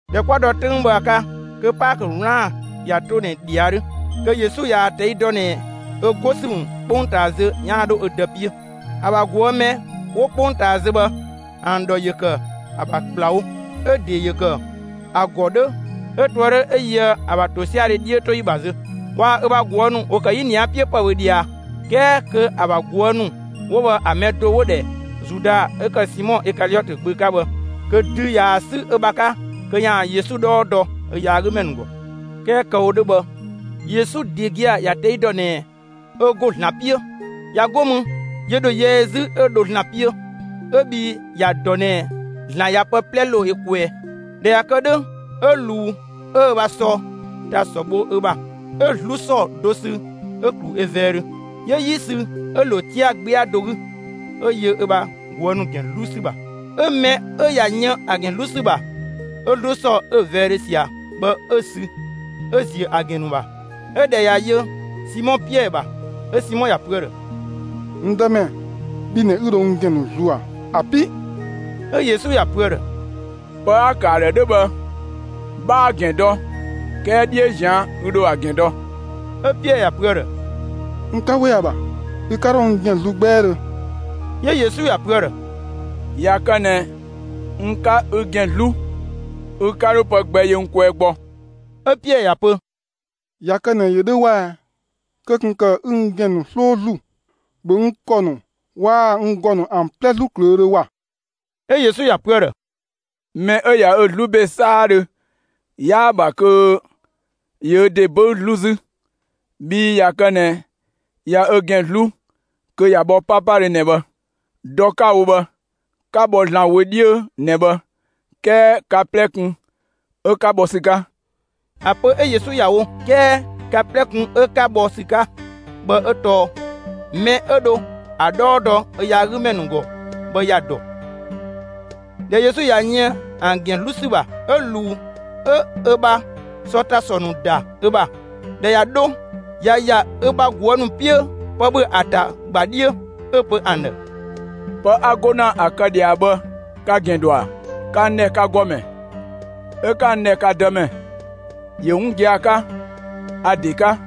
꞊Dhɛ 'kwa dɔ 'töng bhë ‑a 'ka, kö Paakö 'wlaan‑ ꞊ya 'to ꞊nɛ ꞊dhia 'dhö, kö Yesu ꞊yaa‑ ꞊tɛi' dɔ ꞊nɛ ö 'go ‑sü ‑mü 'kpongtaa zö ‑yaan 'dho ö Dë 'piö. ‑A ‑bha mɛ 'wo 'kpongtaa zö bhë ‑an ‑dhɔ ‑yö ‑kë ‑a ‑bha ‑kplawo; 'ö‑ ‑de ‑yö ‑kë ‑a ‑gɔ 'dhö 'ö ꞊toë' 'dhö 'ö yöë ‑a ‑bha ‑tosiadhe 'dhiötoyi ‑bha zö. Waa‑ ö ‑bha ꞊guë' ‑nu ‑wo ‑kë 'yinia 'piö ‑pë ‑bhö ꞊dhia, 'kɛɛ kö ‑a ‑bha ꞊guë' ‑nu 'wo bhë ‑a mɛ 'wo‑ ‑dhɛ Zuda 'ö ‑kë Simɔ Ikaliɔtö gbö 'ka bhë, kö dü ꞊yaa‑ 'sü ö ‑bha 'ka kö ‑yaan Yesu 'dhɔɔ dɔ ö yaagümɛ ‑nu ‑gɔ. 'Kɛɛ kë‑ wo 'dhö bhë, Yesu ‑de gia‑ ‑ya ꞊tɛi' dɔ ꞊nɛ ö ‑go ‑Zlan 'piö; ꞊ya 'go mü, ‑yö ‑dho yɛ ö 'zü 'ö dho ‑Zlan 'piö, 'ö bhii ‑ya dɔ ꞊nɛ ‑Zlan ‑ya pë 'plɛ ‑lo ö kwɛɛ. ꞊Dhɛ ꞊ya kë 'dhö, 'ö ꞊luu 'ö ö ‑bha sɔ ‑ta ‑sɔ bho ö ‑bha, 'ö 'zlu ‑sɔ do sü ö‑ ‑klu ö vɛɛdhö. 'Yö 'yi sü 'ö‑ ‑lo 'tia‑ 'gbɛa do 'gü, 'ö yö ö ‑bha ꞊guë' ‑nu ‑gɛn 'zlu ‑sü ‑bha. 'Ö‑ mɛ 'ö ꞊ya yën ‑a ‑gɛn 'zlu ‑sü ‑bha, 'ö 'zlu ‑sɔ 'ö‑ vɛɛdhö ꞊sia bhë, 'ö‑ sü 'ö‑ ‑ziö ‑a ‑gɛn ‑nu ‑bha. 'Ö ꞊dhɛ ꞊ya yö Simɔ Piɛɛ ‑bha, 'ö Simɔ ‑ya pö ‑a ‑dhë: «N Dëmɛ, bhi ꞊nɛ 'ü dho n ‑gɛn ‑nu zlu ꞊a, ‑abi'!» 'Ö Yesu ‑ya pö ‑a ‑dhë: «Pë 'a‑ ‑kë ‑a ‑dhë 'dhö bhë, 'bhaa‑ ‑gɛn dɔ, 'kɛɛ 'dhiö ꞊zian' ü ‑dho ‑a ‑gɛn dɔ.» 'Ö Piɛɛ ‑ya pö ‑a ‑dhë: «N 'ka 'we ‑a ‑bha, ü 'ka 'dho n ‑gɛn zlu 'gbɛɛdhö!» 'Yö Yesu ‑ya pö ‑a ‑dhë: «꞊Ya kë ꞊nɛ n 'ka ü ‑gɛn ‑nu 'zlu, ü 'ka 'dho pë gbɛ yö n kwɛɛ gbɔ.» 'Ö Piɛɛ ‑ya pö: «꞊Ya kë ꞊nɛ ‑yö 'dhö 'wɛa‑, kö ꞊kun ‑kë 'ü n ‑gɛn ‑nu 'sloo zlu, ‑bhö n ‑kɔ ‑nu waa‑ n ‑gɔ ‑an 'plɛ 'zlu ꞊klöödhö ‑wa!» 'Ö Yesu ‑ya pö ‑a ‑dhë: «Mɛ 'ö ꞊ya ö zlu ‑be 'saadhö, 'yaa‑ ‑bha kö ‑yö ö ‑de 'böü 'zlu 'zü; bhii ꞊ya kë ꞊nɛ ꞊ya ö ‑gɛn 'zlu, kö ꞊ya bhɔ 'papadhö ꞊nɛ bhë. Dɔ 'ka‑ wo bhë, 'ka bhɔ ‑Zlan wö 'dhiö ꞊nɛ bhë; 'kɛɛ ka 'plɛ kun 'ö 'ka bhɔ ‑sü 'ka.» ‑A pö 'ö Yesu ‑ya wo «'kɛɛ ka 'plɛ kun 'ö 'ka bhɔ ‑sü 'ka» bhë 'ö tɔɔ mɛ 'ö dho ‑a 'dhɔɔ dɔ ö yaagümɛ ‑nu ‑gɔ bhë ‑ya ‑dɔ. ꞊Dhɛ Yesu ꞊ya yën ‑an ‑gɛn ‑nu 'zlu ‑sü ‑bha, 'ö ꞊luu 'ö ö ‑bha sɔ ‑ta ‑sɔ ‑nu ‑da ö ‑bha; ꞊dhɛ ꞊ya 'dho ꞊ya ‑ya ö ‑bha ꞊guë' ‑nu 'piö pë ‑bhö ‑a ‑ta ꞊gba 'dhiö, 'ö‑ pö ‑an ‑dhë: «Pë 'a 'go ‑na ‑a kë ꞊dhia bhë, ka‑ ‑gɛn ‑dɔ ‑a? Ka n ‑dhɛ ka ‑Gɔmɛ, 'ö 'ka n ‑dhɛ ka Dëmɛ; ‑yö 'wun gia‑ 'ka, a‑ ‑de 'ka.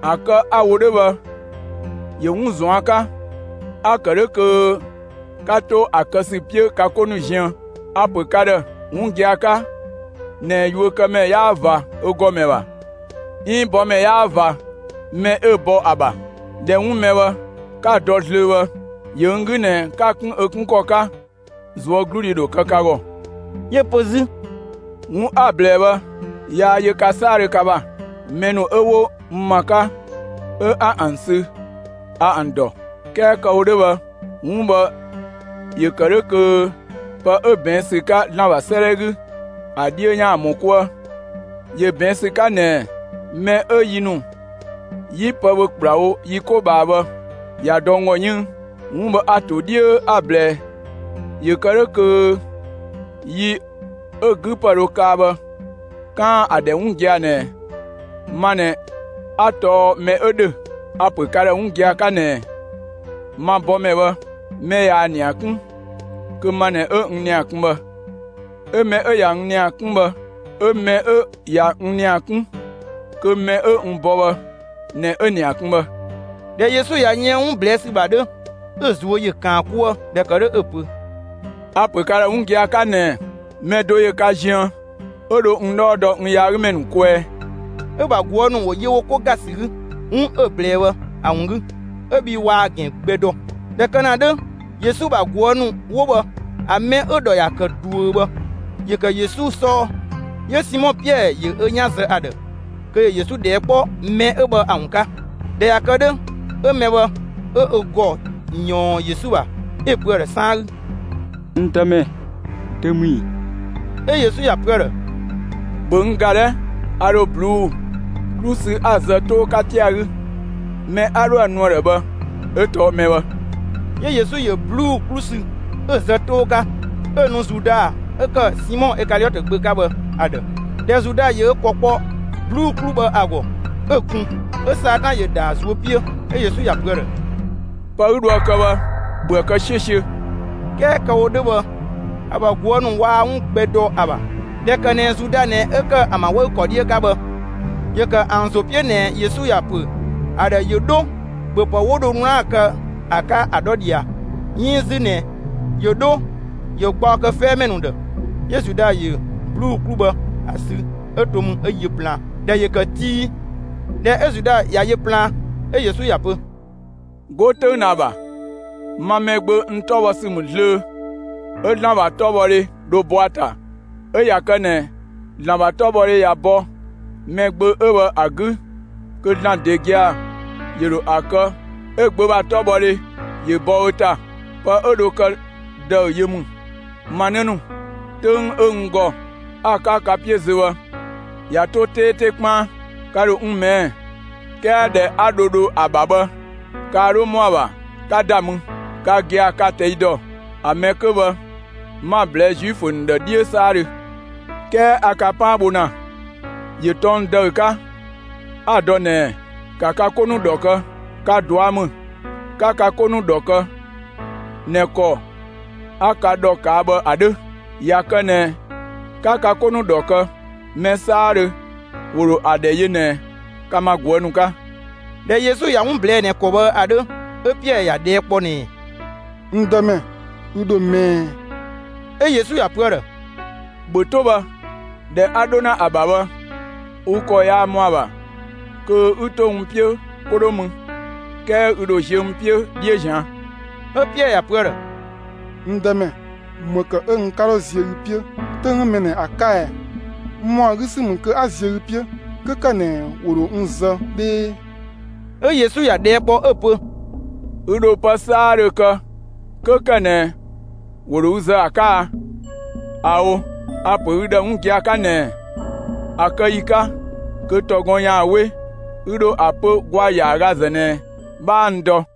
‑A kë 'a‑ wo 'dhö bhë, ‑yö 'wun ꞊zuan' 'ka, 'a‑ ‑kë 'dhö kö 'ka 'to ‑a kë ‑sü 'piö ka 'ko ‑nu ziën. A‑ ‑pö ka ‑dhë 'wun gia‑ 'ka ꞊nɛ yuökëmɛ 'yaa ꞊va ö ‑gɔmɛ ‑bha, 'iin bɔmɛ yaa ꞊va mɛ 'ö‑ bɔ bhë ‑a ‑bha. ꞊Dhɛ 'wun mɛ bhë 'ka‑ dɔ zlöö bhë, ‑yö n 'gü ꞊nɛ 'ka‑ 'kun ‑a 'kun ‑kɔ 'ka ꞊zuögludhi ‑dho kë ka ‑gɔ.» 'Yö‑ pö 'zü: «'Wun 'a‑ ꞊blɛɛ bhë, yaa yö ka 'saadhö ka ‑bha; mɛ ‑nu 'ö 'wo n ‑ma 'ka 'ö 'a ‑an sü, a ‑an ‑dɔ. 'Kɛɛ kë‑ wo 'dhö bhë, 'wun bhë ‑yö ‑kë 'dhö kö pë 'ö ꞊bɛɛn' ‑sü 'ka ‑Zlan ‑bha 'sëëdhɛ 'gü, ‑a 'dhiö ‑yaan ‑mɔ 'kuë. ‑Yö ꞊bɛɛn' ‑sü 'ka ꞊nɛɛ: Mɛ 'ö yi ‑nu 'yi pë ‑bhö ‑kplawo yi 'ko ꞊bhaa bhë, ꞊ya dɔ n ‑gɔ 'yënng. 'Wun bhë a‑ ‑to 'dhiö 'a‑ ꞊blɛɛ ‑yö kë 'dhö kö yi 'ö ‑a 'gü ‑pë dho kaa bhë, 'kaan‑ ‑a ‑dhɛ 'wun gia‑ ꞊nɛ ma ꞊nɛ 'a tɔɔ mɛ 'ö ‑dhö. A‑ ‑pö ka ‑dhë 'wun gia‑ 'ka ꞊nɛɛ: Ma bɔmɛ bhë, mɛ ꞊yaa‑ ‑nia 'kun, kö ma ꞊nɛ 'ö n ‑nia kun bhë; 'ö mɛ 'ö ꞊ya n ‑nia 'kun bhë; 'ö mɛ 'ö ꞊ya n ‑nia 'kun, kö mɛ 'ö n bɔ bhë ꞊nɛ 'ö‑ ‑nia kun bhë.» ꞊Dhɛ Yesu ꞊ya yën 'wun ꞊blɛɛ' ‑sü ‑bha 'dhö, 'ö‑ ꞊zuö' ‑yö ‑kaan 'kuë, ꞊dhɛ ‑kë 'dhö 'ö‑ pö: «A‑ ‑pö ka ‑dhë 'wun gia‑ 'ka ꞊nɛɛ: Mɛ do ‑yö ka ziën 'ö dho n 'dhɔɔ dɔ n yaagümɛ ‑nu kwɛɛ.» 'Ö‑ ‑bha ꞊guë' ‑nu ‑wo yö wo 'ko ‑ga ‑sü 'gü 'wun 'ö‑ ꞊blɛɛ bhë ‑a ‑wun 'gü, 'ö bhii waa‑ ‑gɛn gbɛ dɔ. ꞊Dhɛ kë ‑na 'dhö, Yesu ‑bha ꞊guë' ‑nu 'wo bhë ‑a mɛ 'ö‑ ‑dhɔ ‑ya ‑kë ꞊duö bhë, ‑yö ‑kë Yesu 'sɔɔ. 'Yö Simɔ Piɛɛ ‑yö ö 'yan zë ‑a ‑dhë kö ‑yö Yesu ꞊dhɛɛ' kpɔ mɛ 'ö bhë ‑a ‑wun 'ka. ꞊Dhɛ ꞊ya kë 'dhö, 'ö mɛ bhë 'ö ö ‑gɔ ꞊yɔɔn Yesu ‑bha, 'ö‑ pö ‑a ‑dhë 'saan 'gü: «N Dëmɛ, dö ‑mü ‑ii?» 'Ö Yesu ‑ya pö ‑a ‑dhë: «‑Bhö n ‑ga 'dhɛ! A ‑dho ꞊bluu'‑ 'klu sü 'a‑ zë 'too 'ka 'tia‑ 'gü; mɛ 'a 'dhoë‑ nu ‑a ‑dhë bhë 'ö tɔɔ mɛ bhë.» 'Yö Yesu ‑yö ꞊bluu'‑ 'klu sü, 'ö‑ zë 'too 'ka, 'ö‑ nu Zuda 'ö ‑kë Simɔ Ikaliɔtö gbö 'ka bhë ‑a ‑dhë. ꞊Dhɛ Zuda ‑yö ö ‑kɔ kpɔ ꞊bluu'‑ 'klu bhë ‑a ‑gɔ, 'ö‑ kun, 'ö Satan ‑yö ‑da ‑a ꞊zuö' 'piö. 'Ö Yesu ‑ya pö ‑a ‑dhë: «Pë 'ü dhoë‑ kë bhë, ‑bhöë kë 'siö‑ siö‑!» 'Kɛɛ kë‑ wo 'dhö bhë, ‑a ‑bha ꞊guë' ‑nu waa 'wun gbɛ dɔ ‑a ‑bha. ꞊Dhɛ ‑kë ꞊nɛ Zuda ꞊nɛ 'ö ‑kë ‑an ‑bha 'wëü‑ ‑kɔ 'dhiö 'ka bhë, 'yö ‑kë ‑an ‑zo 'piö ꞊nɛ Yesu ‑ya ‑pö ‑a ‑dhë ‑yö 'dho ‑bhöpë 'wo dho 'wlaan‑ kë ‑a 'ka ‑a 'dhɔ ꞊dhia 'iin 'zü ꞊nɛ ‑yö 'dho ‑yö gbaɔ kë 'fɛɛmɛ ‑nu ‑dhë. 'Yö Zuda ‑yö ꞊bluu'‑ 'klu bhë ‑a sü 'ö to mü 'ö yö plaan. ‑Dhɛ ‑yö ‑kë tii. ꞊Dhɛ 'ö Zuda ꞊ya yö plaan, 'ö Yesu ‑ya pö: «'Go 'töng ꞊nɛ ‑a ‑bha, ma Mɛgbö, n 'tɔbhɔsü ‑mü zlöö; 'ö ‑Zlan ‑bha 'tɔbhɔdhe dhö bɔ ‑a ‑ta. 'Ö ꞊ya kë ꞊nɛ ‑Zlan ‑bha 'tɔbhɔdhe ꞊ya bɔ Mɛgbö 'ö bhë ‑a 'gü kö ‑Zlan ‑de gia‑ ‑yö ‑dho ‑a kë 'ö‑ Gbö ‑bha 'tɔbhɔdhe ‑yö bɔ ö ‑ta. Pë 'ö‑ ‑de dho kë ‑dëü yö ‑mü. Ma 'në ‑nu, 'töng 'ö n ‑gɔ 'a‑ 'ka ka 'piö zö bhë ꞊ya 'to 'teete 'kpaan. Ka ‑dho n ꞊mɛɛ', 'kɛɛ ‑dhɛ 'a dho dho ‑a ‑bha bhë, kaa 'dho ‑mɔa ‑bha 'ka ‑da mü. Ka gia‑ ka‑ ꞊tɛi' ‑dɔ. ‑A mɛ 'kö bhë 'ma‑ ꞊blɛɛ' Zuifö ‑nu ‑dhë 'dhiö 'saadhö. 'Kɛɛ a ka 'paan bho ‑na, ‑yö tɔng ‑dëü 'ka, 'a‑ dɔ ꞊nɛɛ: ‑Ka ka 'ko ‑nu ‑dhɔ kë. Ka ꞊dua' ‑mü 'ka ka 'ko ‑nu ‑dhɔ kë ꞊nɛ ‑kɔ 'a ka ‑dhɔ ꞊kaa' bhë ‑a 'dhö. ꞊Ya kë ꞊nɛ 'ka ka 'ko ‑nu ‑dhɔ kë, mɛ 'saadhö ‑wo ‑dho ‑a ‑dhɛ yö ꞊nɛ ka ma ꞊guë' ‑nu 'ka.» ꞊Dhɛ Yesu ꞊ya 'wun ꞊blɛɛ'‑ ꞊nɛ ‑kɔ bhë ‑a 'dhö, 'ö Piɛɛ ‑ya ꞊dhɛɛ' kpɔ ꞊nɛɛ: «N Dëmɛ, ü ‑dho mɛɛ?» 'Ö Yesu ‑ya pö ‑a ‑dhë: «‑Bhö 'to bhë! ‑Dhɛ 'a 'dho ‑na ‑a ‑bha bhë, ü ‑kɔ yaa ‑mɔa ‑bha kö 'ü 'to n 'piö 'ko 'dho mü, 'kɛɛ ü ‑dho ziö n 'piö 'dhiö ꞊zian'.» 'Ö Piɛɛ ‑ya pö ‑a ‑dhë: «N Dëmɛ, ‑më ‑kë 'ö n 'ka dho ziö ü 'piö 'töng mɛ ꞊nɛ ‑a 'ka ɛɛ? N ‑mɔa 'gü ‑sü ‑mü kö 'a ziö ü 'piö 'kö ‑kë ꞊nɛ ‑wo ‑dho n zë 'dhee!» 'Ö Yesu ‑ya ꞊dhɛɛ' kpɔ, 'ö‑ pö: «Ü ‑dho pë 'saadhö kë 'kö ‑kë ꞊nɛ ‑wo ‑dho ü zë ‑a 'ka a? ꞊Ao'! A‑ ‑pö ü ‑dhë 'wun gia‑ 'ka ꞊nɛɛ: ‑A kë ‑yi 'ka kö ‑tɔ gɔn ‑yaan 'we, ü ‑dho ‑a pö ‑gwaa ‑yaagazë ꞊nɛ 'bhaa n dɔ.»